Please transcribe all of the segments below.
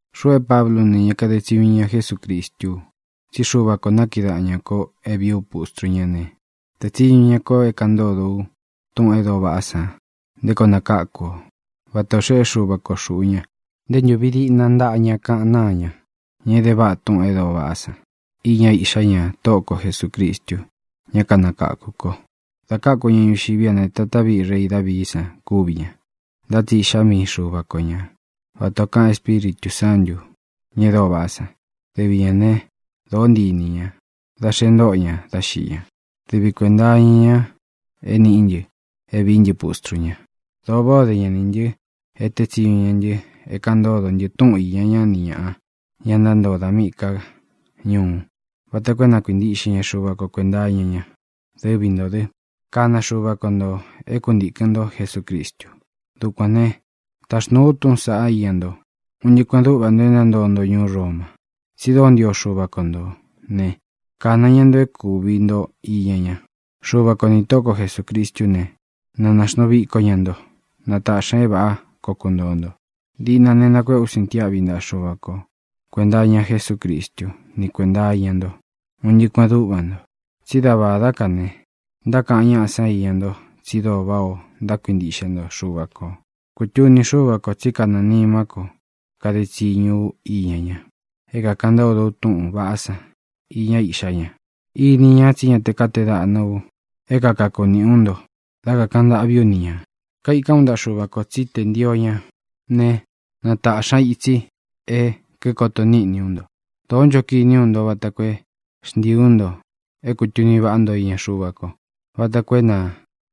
Xuꞌu é Pablú u ne, ña kade tsiñu iña Jesúcristú u. Tsí Xuva kō nákiꞌi daꞌan ñā ko é vīí u pustru ñá ne, tēe tsiñu ña ko é kāꞌan ntódo u túꞌūn e dóo vaꞌá san nté koo nakáku ō, vata ō xeꞌé Xuva ko xūꞌu ña nte ntúvi diꞌna ntaꞌa ña kaꞌan náa ña, ña é de váꞌa túꞌūn e dóo vaꞌá san iña Iꞌxá ña, Tóꞌo ko Jesūcristu, ñá kanakākú kō. Dā káku ña ñuxiví a ne, tatá viꞌi rei Davií san kúvi ña, ntá tsi iꞌxá mii Xuva ko ña vata ō kaꞌan Espíritū Sántū, ña e dóo vaꞌá san. Dɨvi ñā né, dōó ntii inī ña, da xe ntóto ña dá xiꞌi ña. Dɨvi kuēnta iña ña é nīꞌí ntɨ é vīí ntɨ pustru ña. Dōo váꞌā o dé ña nī ntɨ e tée tsiñu ña ntɨ é kāꞌan ntódo ntɨ túꞌun īña ñá ni ñāꞌa, ña ntántoo da míꞌī ká ñuu, vata koo é na kuintiꞌxe ña Xuva ko kuēnta iña ña. Dɨvi ntō dɨ́, kana Xuva ko ntō é kuntīkɨn ntó Jesucristu. Dukuān né, taxnūu u túꞌūn saꞌá iña nto, un ntɨꞌɨ kuēꞌen dúꞌva nto e ntántoo nto ñuú Roma, tsi dóo ntio Xuva ko ntō né, kāna ña nto é kūvi nto iña ña. Xuva ko nī Tóꞌo ko Jesūcristú ne, na nāxnuu viko ña nto. Na tāꞌxi ña é vāꞌá koo kuntōo nto. Diꞌna ne, nakuéꞌe ú sintiáꞌvi ntaꞌa Xuvā kó kuenta iña Jesúcristu ni kuénta iña nto, un ntɨꞌɨ kuēꞌen dúꞌva nto. Tsi dá vādá ka ne, ntákaꞌan ñáꞌa san íña nto tsi dóo váꞌā o ntákuintiꞌxe nto Xuva kō. Kutuni Xúva kō tsí kanɨɨ̄ nimá ko kade tsiñu ú iña ña, é kākaꞌan ntódo u túꞌūn vaꞌá san iña Iꞌxá ña. Ini ña tsí ña te kátee daꞌna u é kakaku nīꞌí u nto dá kakāꞌan ntâꞌví u ni ñā. Kaikán u ntaꞌa Xuva kō tsí tē ntio ña ne, na tāꞌxi ña itsi é kīkoto níꞌni ú nto. Dōó ncho kiní u nto vata koo é xntiī ú nto é kūtuni váꞌa nto iña Xuva ko, vata koo é na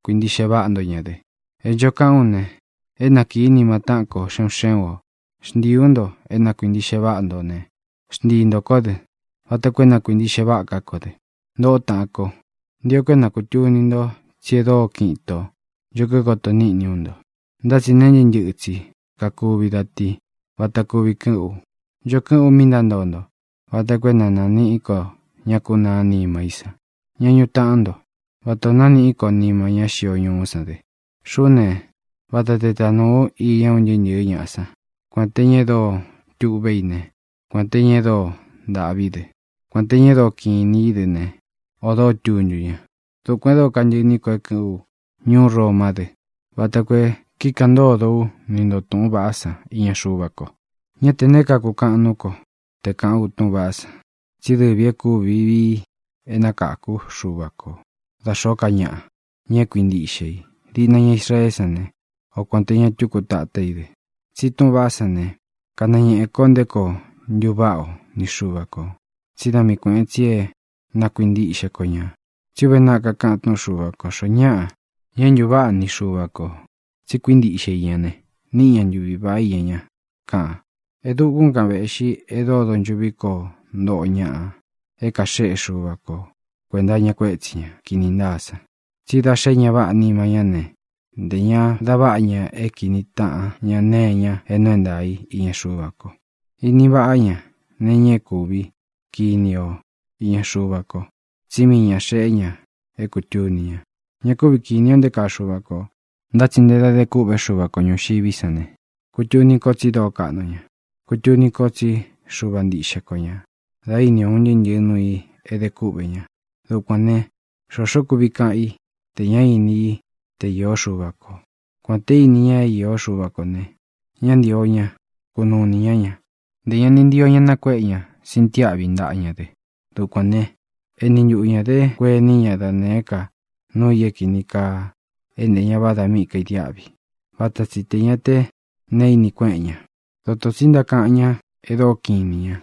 kuīntiꞌxe váꞌa nto ña dɨ. E ncho kaꞌán u ne, é nakīí nima táꞌan kō, xé un xé un ō. Xntiī ú nto é na kuīntiꞌxe váꞌa nto ne, xntii ntō kó dɨ vata koo é na kuīntiꞌxe váꞌa ká ko dɨ. Ntōꞌó taꞌan ko, ntio ko é na kūtuni nto tsí e dóo kiꞌin itō ncho kíkoto níꞌni ú nto. Ntá tsi neé ntɨꞌɨ tsi kakuvi da ti vata kuvi kɨꞌɨ́n u. Ncho kɨ́ꞌɨn ú mi ntántoo nto vata koo é na nāniꞌí ko ña kúnaa nima í san, ña ñuꞌu taꞌán nto, vatā o nániꞌí ko nima ñá xio ñuú san dɨ. Xuꞌú ne, vata te tanūu ú iña un ntɨɨ́ ntɨ̄ɨ́ ñaꞌa san, kuān te ña e dóo tuꞌvé i ne, kuān te ña e dóo ntāꞌví dɨ, kuān te ña e dóo kiꞌin inī í dɨ ne, ō dóo tuntu ña. Dukuān e dóo kantɨꞌɨ iní ko é kɨ̄ꞌɨn ú ñuú Romá dɨ vata koo e kíkaꞌan ntódo ú ni ntō túꞌūn vaꞌá san iña Xuva ko. Ñá tē neé kakukaꞌan nuú ko te kāꞌán u túꞌūn vaꞌá san. Tsí dɨvī é kūvi vii é nakākú Xuva ko da xōó ka ñaꞌa, ña é kuīntiꞌxe i, diꞌna ña Israeé san ne, o kuān te ña túku tatá i dɨ. Tsi túꞌūn vaꞌá san ne, kanañēꞌe ko nté koo ntuváꞌa o ni Xuva kō: tsí da mii kuēꞌen tsi é na kuintiꞌxe ko ñā. Tsí uve naꞌa kakaꞌan túꞌun Xuva kō: “Xoó ñaꞌa, ña é ntūváꞌa ni Xuva kō tsi kuíntiꞌxe i ña ne, níꞌi ña ntuvi vāꞌá iña ña”, kaꞌan. E dúkūn kan véꞌxi e dóo donchuꞌví koo ntoꞌo ñaꞌa é kāxeꞌé Xuva ko kuēnta iña kuétsī ña kini ntáa san. Tsi da xé ña váꞌa nima ñá ne, ntē ña da váꞌa ña é kīní taꞌan ña nee iña é nuu é ntaā í iña Xuva ko. Ini váꞌa ña nee iña é kūvi kiní o iña Xuva ko, tsí mii ñā xeꞌé ña é kūtuni ña. Ña kúvi kīni o nté kaa Xuva kō, ntá tsi nté da de kûꞌvé Xuva ko ñūxiví san ne, kutuni ko tsi dóo kaꞌnu ña. Kutuni ko tsí Xuva ntiꞌxe ko ñā dá ini o un ntɨꞌɨ nuū i é de kúꞌvē ña. Dukuān ne, xoxó kuvi kaꞌán i tē ñá ini i te īó Xuva kō. Kuān té ini ña é īó Xuva kō ne, ña ni ntío ña kunuu inī ñá ña, ntē ña ni ntio ña nakuéꞌe ña sintiáꞌvi ntaꞌa ña dɨ. Dukuān né, eni ntuꞌu ñā dé kuení ña da nēé ka nuu i é kīni kaa é ntē ña váda mí kaidiáꞌvi. Vata tsi tē ña té neé ini kueꞌen ña. Dotō tsi ntákaꞌan ñá e dóo kiꞌin inī ña,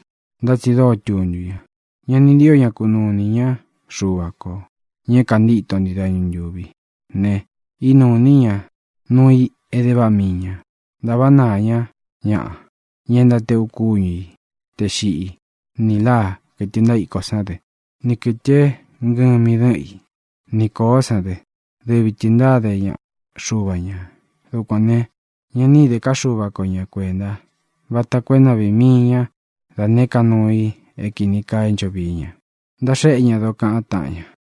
ntá tsi dóo tuntu ña. Ña ni ntío ña kunuu inī ñá Xuva kō, ña é kāntíto ntii dañu ntūvi ne, ínuu inī ñá nuu i é de váꞌa mii ñā. Ntāváꞌa naā ñá ñaꞌa, ña ntáteꞌu kúñu i tē xiꞌí, nī láa, kɨ̄tɨ ntaíko sán dɨ, ni kɨ̄tɨ é ngɨmi dɨ́ꞌɨn i, ni kōó san dɨ. Dɨvi tɨ̄ ntáde ña xuva ñā. Dukuān ne, ña ni íde ká Xuva ko ña kuēnta vata koo é na vīi mii ña dá nēé ka nuu i é kīni kaa é ncho vií ña. Ntaxéꞌe ña dokaꞌan táꞌan ña.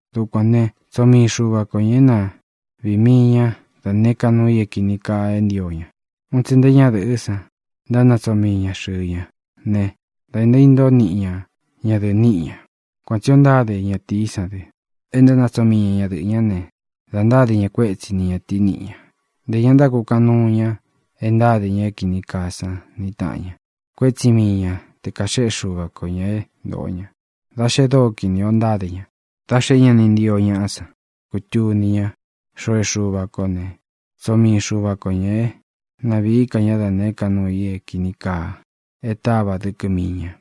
Dukuān né, tsoo mii Xuva ko ñā é na viī mii ñá da nēé ka nuu i é kīni kaa é ntio ña. Un tsi nté ñadɨ̄ꞌɨ́ san ntánatsoo mii ña xɨ̄ɨ ña ne, da ntaíntóo niꞌi ña ñadɨ̄ꞌɨ niꞌi ña. Kuan tsī o ntáde ñatīí san dɨ, e ntánatsoo mii ña ñadɨꞌɨ̄ ñá ne, da ntáde ña kuétsi ni ñatīí niꞌi ña. Ntē ña ntákukaꞌan nuu ña e ntáde ña é kini kaa san ni tāꞌan ña. Kuétsi mii ña te kāxéꞌe Xuva ko ñā é ntōꞌo ña, da xe dóo kinī o ntáde ña. Dā xé ña ni ntio ñaꞌá san kutuni ñá xoo é Xuva kō ne, tsoo mii Xuva ko ñā é na vīí ka ña da nēé ka nuu i é kīni kaa e táva dɨkɨ mii ña.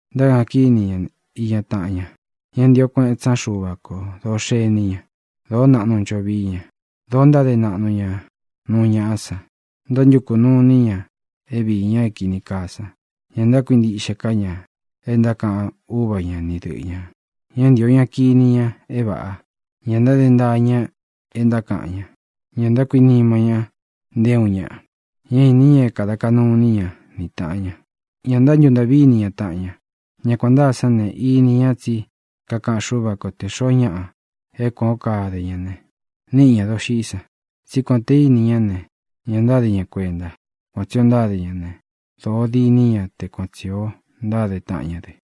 Ntákaꞌan kíni ña iña taꞌan ña. Ñá ntīo kueꞌen tsí ña Xuva kō. Dōo xení ña. Dōo naꞌnu ncho vií ña. Dōo ntáde naꞌnu ña nuu ñaꞌá san. Ntántukū nuu iní ña é viī ña é kīni kaa san. Ña ntákuintiꞌxe ká ña é ntákaꞌan úva ña ni dɨꞌɨ ñā. Ñá ntīo ña kini ña é vāꞌa. Ña ntáde ntaa ña é ntákaꞌan ña. Ña ntákuinima ña nté uun ñaꞌa. Ñá īni ña é kāda kaꞌnu iní ña ni tāꞌan ña. Ña ntántuntaꞌví ini taꞌan ña. Ña kuān ntáa sán ne, ini ña tsí kakaꞌan Xúva ko te xōo ñáꞌa é kuān ó kade ña ne, níꞌi ñā doxiꞌí san. Tsí kuān té ini ñá ne, ña ntáde ña kuenta. Kuan tsī o ntáde ña ne, dōo diní ña te kuan tsī o ntáde taꞌan ña dɨ.